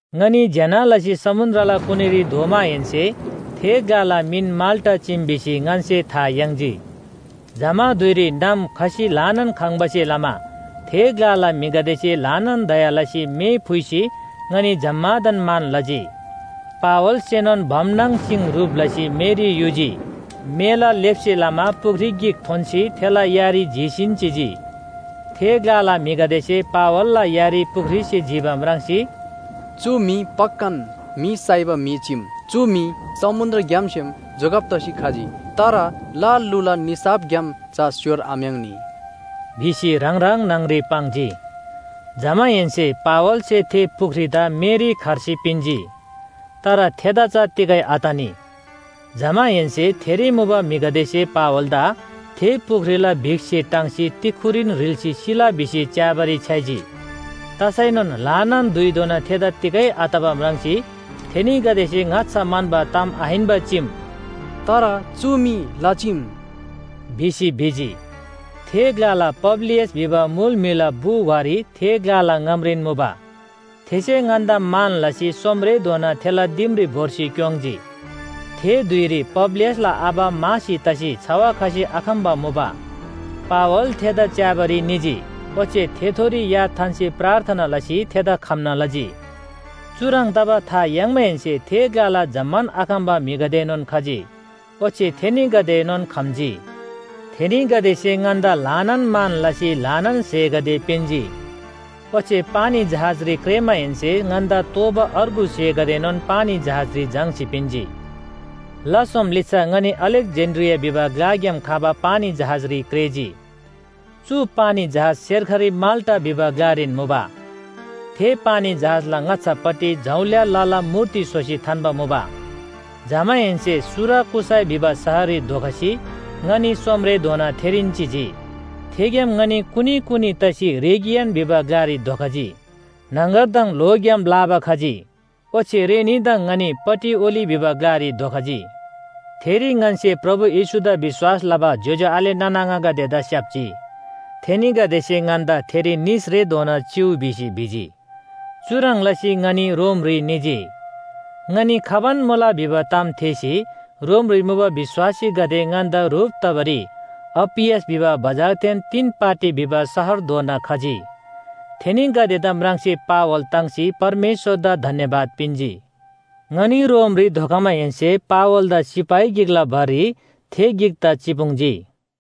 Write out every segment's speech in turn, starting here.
ङनी ज्‍यना लसी समुन्‍द्रला कुनीरी धोमाहेन्‍से थे ग्‍लाला मिन माल्‍टा चीम भिसी ङन्‍से था याङ्जी। जमा धुइरी नाम खसी ल्‍हानान खङ्बासे लमा थे ग्‍लाला म्‍हिगदेसे ल्‍हानान दया लसी मे फुइसी ङनी जम्‍मादान मान लजी। पावलसेनोन भम नाङ सिङ ह्रुप लसी मेरी युजी। मेला लेप्‍से लमा पुख्री गिक थोन्‍सी थेला यारी जीसीन चिजी। थे ग्‍लाला म्‍हिगदेसे पावलला यारी पुख्रीसे जिबा म्राङ्सी, “चु म्‍हि पक्‍कान म्‍हि साइबा म्‍हि चीम। चु म्‍हि समुन्‍द्रग्‍यामसेम जोगब तसी खजी। तर ल लुला निसाफग्‍याम चा स्‍योर आम्‍याङ्नी” भिसी ह्राङ ह्राङ न्‍हङरी पाङ्जी। जमाहेन्‍से पावलसे थे पुख्रीदा मेरी खर्सी पिन्‍जी। तर थेदा चा तिगै आतनी। जमाहेन्‍से थेरी मुबा म्‍हिगदेसे पावलदा थे पुख्रीला बिखसे टाङ्सी तिक्‍खुरीन ह्रिल्‍सी सिला भिसी च्‍याबारी छ्‌याइजी। तसैनोन ल्‍हानान धुइधोना थेदा तिगै आतबा म्राङ्सी थेनीगदेसे ङाच्‍छा म्‍हन्‍बा ताम आहिन्‍बा चीम “तर चु मी ल चीम” भिसी भिजी। थे ग्‍लाला पब्‍लियस भिबा मुल म्‍हिला बु वारी थे ग्‍लाला ङामरीन मुबा। थेसे ङन्‍दा मान लसी सोम‍रेधोना थेला दिमरी भोर्सी क्‍योङ्‌जी। थे धुइरी पब्‍लियसला आबा मासी तसी छवा खसी आखम्‍बा मुबा। पावल थेदा च्‍याबारी निजी, ओच्‍छे थेथोरी या थान्‍सी प्रार्थना लसी थेदा खम्‍ना लजी। चुह्रङ् तबा था याङ्माहेन्‍से थे ग्‍लाला जम्‍मान आखम्‍बा म्‍हिगदेएनोन खजी, ओच्‍छे थेनीगदेएनोन खम्‍जी। थेनीगदेसे ङन्‍दा ल्‍हानान मान लसी ल्‍हानान स्‍हेगदे पिन्‍जी। ओच्‍छे पानी जहाजरी क्रेःमाहेन्‍से ङन्‍दा तोःबा अर्गु स्‍हेगदेएनोन पानी जहाजरी झाङ्‌सी पिन्‍जी। ला सोम लिच्‍छा ङनी अलेक्‍जेन्‍ड्रिया भिबा ग्‍लाग्‍याम खबा पानी जहाजरी क्रेःजी। चु पानी जहाज सेर्खरी माल्‍टा भिबा ग्‍लारीन मुबा। थे पानी जहाजला ङाच्‍छापट्टि जौल्‍या लला मूर्ति स्‍होसी थान्‍बा मुबा। जमाहेन्‍से सुराकुसाई भिबा शहररी धोखसी ङनी सोमरेधोना थेरीन चिजी। थेग्‍याम ङनी कुनी कुनी तसी रेगियन भिबा ग्‍लारी धोखजी। न्‍हङगरदङ ल्‍होग्‍याम लाबा खजी, ओच्‍छे रेनीदङ ङनी पटिओली भिबा ग्‍लारी धोखजी। थेरी ङन्‍से प्रभु येशूदा विश्‍वास लबा ज्‍योज्‍यो आले नाना आङागदेदा स्‍याप्‍जी। थेनीगदेसे ङन्‍दा थेरी निसरेधोना चिउ भिसी भिजी। चुह्रङ् लसी ङनी रोमरी निजी। ङनी खबान मुला भिबा ताम थेःसी रोमरी मुबा विश्‍वासीगदे ङन्‍दा ह्रुप तबारी अप्‍पियस भिबा बजारदेन तीन पाटी भिबा शहरधोना खजी। थेनीगदेदा म्राङ्सी पावल ताङ्सी परमेश्‍वरदा धन्‍यवाद पिन्‍जी। ङनी रोमरी धोखमाहेन्‍से पावलदा सिपाही गिकला भररी थे गिकदा चिपुङ्जी।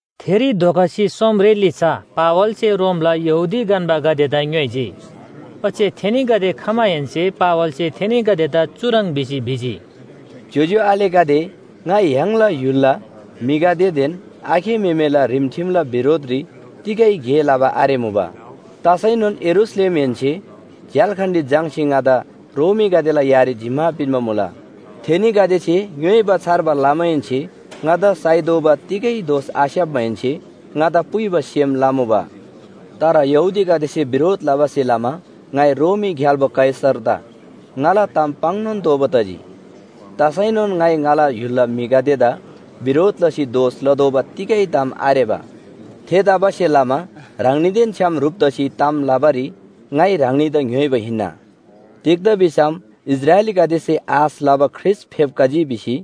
थेरी धोखसी सोमरे लिच्‍छा पावलसे रोमला यहूदी गन्‍बागदेदा ङ्‌योइजी। ओच्‍छे थेनीगदे खमाहेन्‍से पावलसे थेनीगदेदा चुह्रङ् भिसी भिजी, “ज्‍योज्‍यो आलेगदे, ङाइ य्‍हाङला य्‍हुलला म्‍हिगदेदेन आखे म्‍हेमेला रिमठिमला बिरोधरी तिगै गे लबा आरेमुबा। तसैनोन यरूशलेमहेन्‍सेन झ्‍याल्‍खानरी झाङ्‌सी ङादा रोमीगदेला यारी जिम्‍मा पिन्‍बा मुला। थेनीगदेसे ङ्‌योइबा छार्बा लमाहेन्‍से ङादा साइतोःबा तिगै दोष आस्‍याप्‍माहेन्‍से ङादा पुइबा सेम लमुबा। तर यहूदीगदेसे बिरोध लबासे लमा ङाइ रोमी ग्‍याल्‍बो कैसरदा ङाला ताम पाङ्‌नोन तोःबा तजी। तसैनोन ङाइ ङाला य्‍हुलला म्‍हिगदेदा बिरोध लसी दोष लतोःबा तिगै ताम आरेबा। थेतबासेलमा ह्राङनीदेन छ्‌याम ह्रुप तसी ताम लबारी ङाइ ह्राङनीदा ङ्‌योइबा हिन्‍ना। तिग्‍दा भिसम इस्राएलीगदेसे आश लबा ख्रीष्‍ट फेप्‍खजी भिसी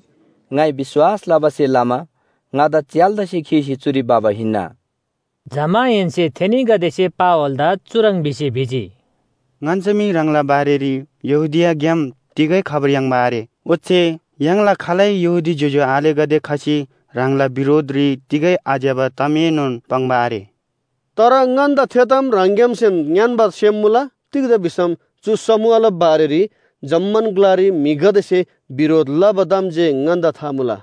ङाइ विश्‍वास लबासे लमा ङादा च्‍याल्‍दासे खीसी चुरी भबा हिन्‍ना। जमाहेन्‍से थेनीगदेसे पावलदा चुह्रङ् भिसी भिजी, “ङन्‍से मी ह्राङला बारेरी यहूदियाग्‍याम तिगै खबर याङ्बा आरे। ओच्‍छे य्‍हाङला खालै यहूदी ज्‍योज्‍यो आलेगदे खसी ह्राङला बिरोधरी तिगै आज्‍यबा तामएनोन पाङ्बा आरे। तर ङन्‍दा थे ताम ह्राङग्‍यामसेन ङ्‌यान्‍बा सेम मुला। तिग्‍दा भिसम चु समूहला बारेरी जम्‍मान ग्‍लारी म्‍हिगदेसे बिरोध लबा ताम जे ङन्‍दा था मुला।”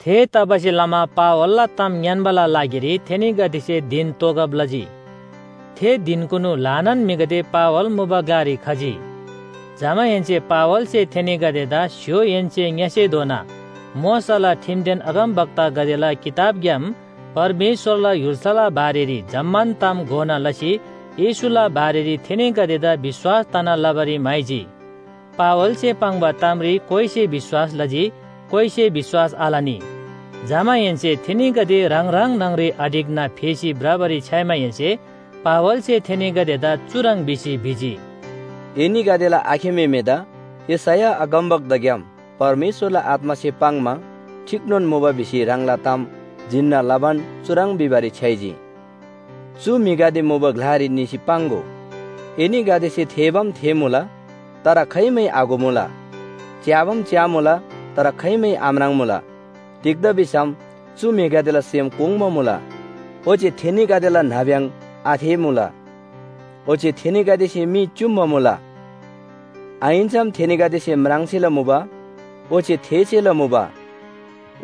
थेतबासेलमा पावलला ताम ङ्‌यान्‍बाला लागिरी थेनीगदेसे धिन तोगब लजी। थे धिनकुनु ल्‍हानान म्‍हिगदे पावल मुबा ग्‍लारी खजी। जमाहेन्‍से पावलसे थेनीगदेदा स्‍य्‍होहेन्‍से ङ्‌यसेधोनान मोशाला ठिमदेन अगमवक्तागदेला किताबग्‍याम परमेश्‍वरला य्‍हुल्‍साला बारेरी जम्‍मान ताम घोना लसी येशूला बारेरी थेनीगदेदा विश्‍वास तना लबारी म्‍हाइजी। पावलसे पाङ्बा तामरी कोइसे विश्‍वास लजी, कोइसे विश्‍वास आलनी। जमाहेन्‍से थेनीगदे ह्राङ ह्राङ न्‍हङरी आढिक्‍ना फेसी भ्रबारी छ्‌याइमाहेन्‍से पावलसे थेनीगदेदा चुह्रङ् भिसी भिजी, “एनीगदेला आखे म्‍हेमेदा यशैया अगमवक्ताग्‍याम परमेश्‍वरला आत्‍मासे पाङ्‌मा ठीकनोन मुबा भिसी ह्राङला ताम जिन्‍ना लबान चुह्रङ् भिबारी छ्‌याइजी। ‘चु म्‍हिगदे मुबा ग्‍लारी निसी पाङ्‍गो एनीगदेसे थेःबाम थेःमुला, तर खाइमै आघोमुला, च्‍याबाम च्‍यामुला, तर खाइमै आम्राङ्‌मुला। तिग्‍दा भिसम चु म्‍हिगदेला सेम कोङ्बा मुला, ओच्‍छे थेनीगदेला नाब्‍यङ आथेःमुला, ओच्‍छे थेनीगदेसे मी च्‍युम्‍बा मुला, आहिन्‍सम थेनीगदेसे म्राङ्सेला मुबा, ओच्‍छे थेःसेला मुबा,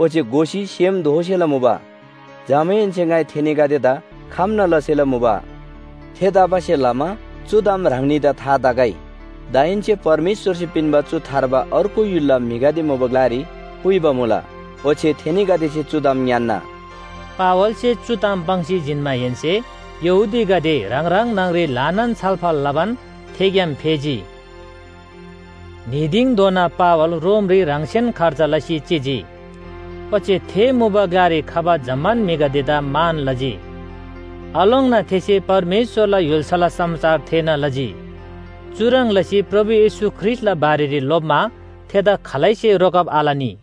ओच्‍छे घोसी सेम दोःसेला मुबा, जमाहेन्‍से ङाइ थेनीगदेदा खम्‍ना लसेला मुबा।’ थेतबासेलमा चु ताम ह्राङनीदा था तगै, दाहेन्‍से परमेश्‍वरसे पिन्‍बा चु थार्बा अर्गु य्‍हुलला म्‍हिगदे मुबा ग्‍लारी पुइबा मुला, ओच्‍छे थेनीगदेसे चु ताम ङ्‌यान्‍ना।” पावलसे चु ताम पाङ्सी जिन्‍माहेन्‍से यहूदीगदे ह्राङ ह्राङ न्‍हङरी ल्‍हानान छलफल लबान थेग्‍याम फेजी। न्‍ही दिङधोना पावल रोमरी ह्राङसेन खर्च लसी चिजी, ओच्‍छे थे मुबा ग्‍लारी खबा जम्‍मान म्‍हिगदेदा मान लजी। आलोङ्ना थेसे परमेश्‍वरला य्‍हुल्‍साला समाचार थेःना लजी, चुह्रङ् लसी प्रभु येशू ख्रीष्‍टला बारेरी लोप्‍मा थेदा खालैसे रोकब आलनी।